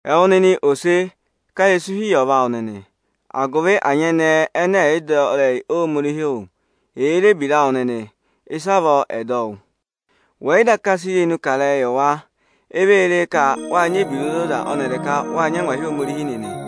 Ẹwụ nịnị ese, ká ịrẹsụ hi yị ọva awụ nịnị, agụvị ẹnyị ẹnẹ ẹ̀ yị dọ ịrẹyị Ohomorihi wụ́, èe re ebira awụ nịnị, ịsavọọ ẹ̀ zụ dọ wụ́. Wẹ̀ yị daka sị irenu kà a yị wa, e vee re ka wáa nyị ebira ozoza ọnịrị ka wáa nyị angwahi Ohomorihi nịnị.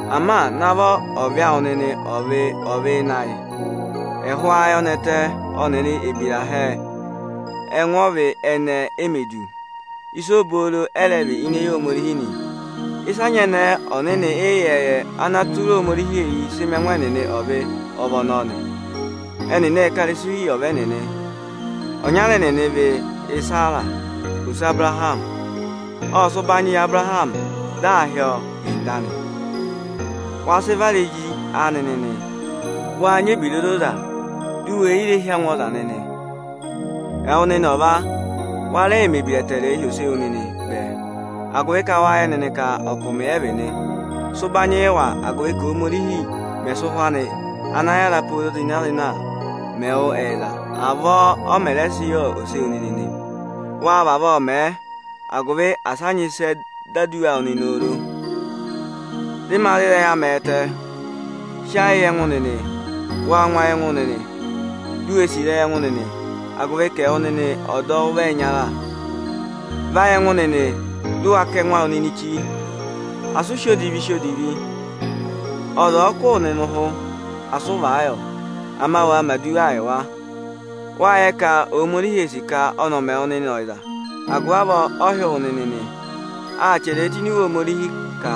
Ama navọ ọvị awụ nịnị ọ̀ vị ọvị ịnị ayị, ẹhụụ ayọnẹtẹ ọnịrị ebira hẹẹ; ẹngụ ọvị ẹnẹẹ e mē du, ịsa obooro ẹ rẹ vị ini eyi Ohomorihi nị. Ịsị anyẹnẹẹ ọnịnị ịyẹẹyẹ ana tụra Ohomorihi eyi sị mẹ ẹngụ ẹnịnị ọvị, ọ vị ọnọọ nị. Ẹnịnị ệ ka ịrẹsụ hi yị ọva ẹnịnị. Ọnyara ịnị ẹnịnị vị Isera, ose Abụrahamị. Ộ sị ụbanyị yị Abụrahamị, dị aa hị́ ọ Ịnda nị. Wa sị vara ezi anị nịnị, wàa nyị ebira ozoza, di u wè yi hí angwa ọza nịnị nị. Ẹwụ nịnị ọva, wa rẹẹ mẹ̀ ebira ẹtẹẹrẹ hi ese wu nịnị bẹẹ, wâ yẹ nịnị ka ọkụmị ẹ vị nị. Sị ụbanyị yị wa, agụvị ka Óhomorihi mẹ̀ sị ụhwẹ ana yára pooro zịna-zịna mẹ wụ ẹyịza, avọọ ọ mẹ̀ rẹ sị yị ese wu nị. Wa vavọọ mẹ nịnị, agụvị asị a nyị ịsị ẹ dọ aduwa awụ nịnị oro. Dị ma za ịrẹyị amị ẹtẹ, sị ayị yị ẹngụ nịnị, waa ngụ ayị ẹngụ nịnị, di u wee sì ịrẹyị ẹngụ nịnị, agụvị ka ẹwụ nịnị ọdọwụ vị ẹyịnyara. Vayị ẹngụ nịnị, dị ụ wa kà ẹngụ awụ nịnị chí. Asị ụ sị odivi sí atọ odivi! Ọza ọ̀ọ kụ́ wụ ụhụ, asị ụ vàa yị ọ. Ama waa mẹ̀ aduwaa yị ọ. Wâ yẹ ka Ohomorihi ee sì ka ọnị ọ̀ mẹ wụ nịnị ẹyịza; agụvị avọọ ọ hị́ wụ nịnị nị. Â chẹrẹ ẹ tụ́ ini Iwe Ohomorihi ka,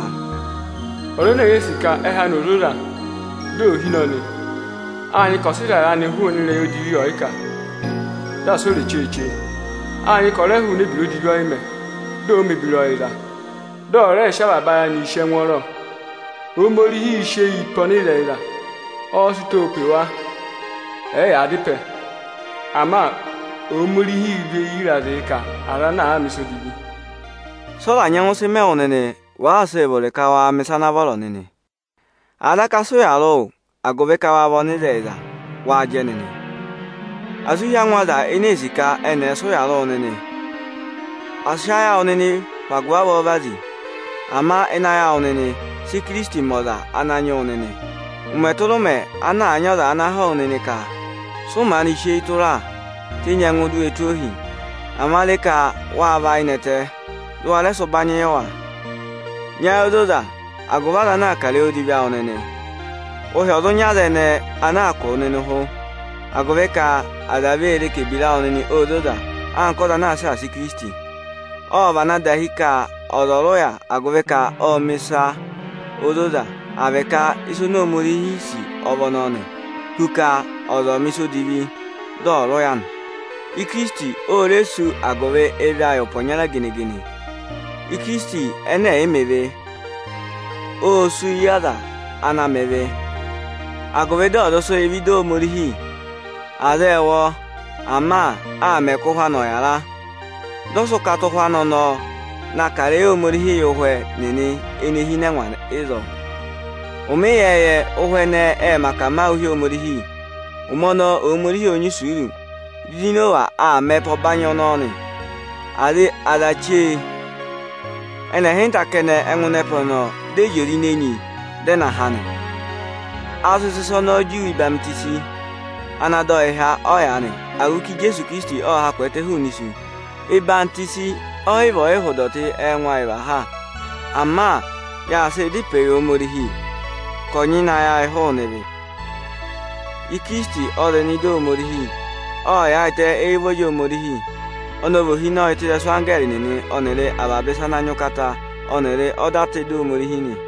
Ọza ene èe sì ka ẹhẹ anị ò zoza, dị ò hine ọnị, ọ hụụnị ịrẹyị odivi ọyịkà, dị asị o re cheeche. Na hụụnị ebira odivi ọyịmẹ̀, dị ọ̀ọ mẹ̀ ebira ọyịza, dị ọ̀ rẹẹ sị avaba ayị anịị sì ẹngwọọrọ. Ananyị yịị̄ sị eyi pe ọnịzẹyịza, ọọ̄ sị ụtọọ pe wa ẹ̀ẹ yaa dá ịpẹ. Ama ọọ̄ và eyi ịrazịị kà aza anaa mẹ̀ ịsa odivi. Sị ọza nyẹngụ sị mẹ wụ nịnị, wàaa sịị vụrị ka wa mẹ̀ ịsa ana vọrọ nịnị? Àa daka aa sị ụyaa rị wụ agụvị ka wáa vị ọnịzẹyịza, waa jẹ nịnị! Asị ụ hí angwa aza ene ee sì ka ẹnị ẹ̀ sị ụya rị wụ nịnị. Asị ayị awụ nịnị hụ agụvị avọọ vazi. Ama ịnị ayị awụ nịnị, sị Ikirisiti mẹ ọza ana nyị wụ nịnị. Ụmẹ tụra ụmẹ ana àa nyị ọza ana họ̀ wụ nịnị ka: Sị ụ maanị sị eyi tụra? Tenyi ẹngụ di u we tụ́ o ohi. Ama re ka waa và ayị nẹtẹ, dị ụ wa rẹ sị ụbanyị yị wa. Nyị ayị ozoza, agụvị aza ana àa kà ịrẹyị odivi awụ nịnị, ụhị ọ̀ zụ nyị aza ẹnẹẹ ana aa kụ̀ wụ nịnị ụhụ, agụvị ka aza vee re ka ebira awụ nịnị óo zoza anka ọza ana aa saasa Ikirisiti. Ộ vana dahi ka ọza ọ̀ rị ụya, agụvị ka ọ́ọ mẹ̀ ịsa ozoza, àa vị ịsị Ohomorihi sì ọ vị ọnọọ nị, hu ka ọza ọ̀ mẹ̀ ịsa odivi, dị ọ rị ụya anị. Ikirisiti ộ rị ụya o mè sú agụvị ịvị ayị ụpẹ ọnya gene-gene. Ikirisiti ẹnẹ ẹ̀ yị mẹ ịvị, ô sú yị aza ana mẹ ịvị, agụvị dị ọ̀ zụ sị yị vẹ ịdị Ohomorihi. Aza ệ wụ ọ, ama â mẹ ka ụhwẹ anị ọ̀ yara. Dị ọ sị ụkata ụhwẹ anị ọnọọ na kà ịrẹyị Ohomorihi yị ụhwẹ nịnị ene hi ịnị ẹngwa ịzọọ. —7.24Ụhwẹ ẹnẹnị vị ụhwẹ aza ana mẹ akamawụ hi Ohomorihi ịyẹẹyẹ. Ụmẹ ọnọọ Ohomorihi ộ nyị isuuru, di Inowa aa mẹ ẹpa ọbanyị ọnọọ nị. Aza chee, ẹnị ịhịnta kẹnẹ ẹ ngụ ịnị ẹpa ọnọọ, dị ẹpa ọnọọ ya ịnị enyi, dị ọ dọ wa ha nị. A zụ sị ịsa ọnọọ juwe ọyịhwenyi, ana dọ yị há ọyaanị, agụvị ka Ijeesu Ikirisiti ộ ha kwẹẹtẹ hụụnị isu. Ọyịhwọzenyi ọ yị vị ọyịhụ ịdọtị ẹngụ ayị và ha. Ama yaa sịị dá ịpẹẹ yị Ohomorihi ka ọ̀ nyịna ayị ayị hụụnị ịvị. Ikirisiti ọ zị nọ ịdị Ohomorihi. Ọ yaayịtẹ éyi ụvọrị Ohomorihi. Ọnị ọ vị Ohinọyị tụ́ ịrẹsụ anggẹẹrị nịnị ọnịrị avaba ịsa ana nyị ụkata ọnịrị ọda tụ́ ịdị Ohomorihi nị.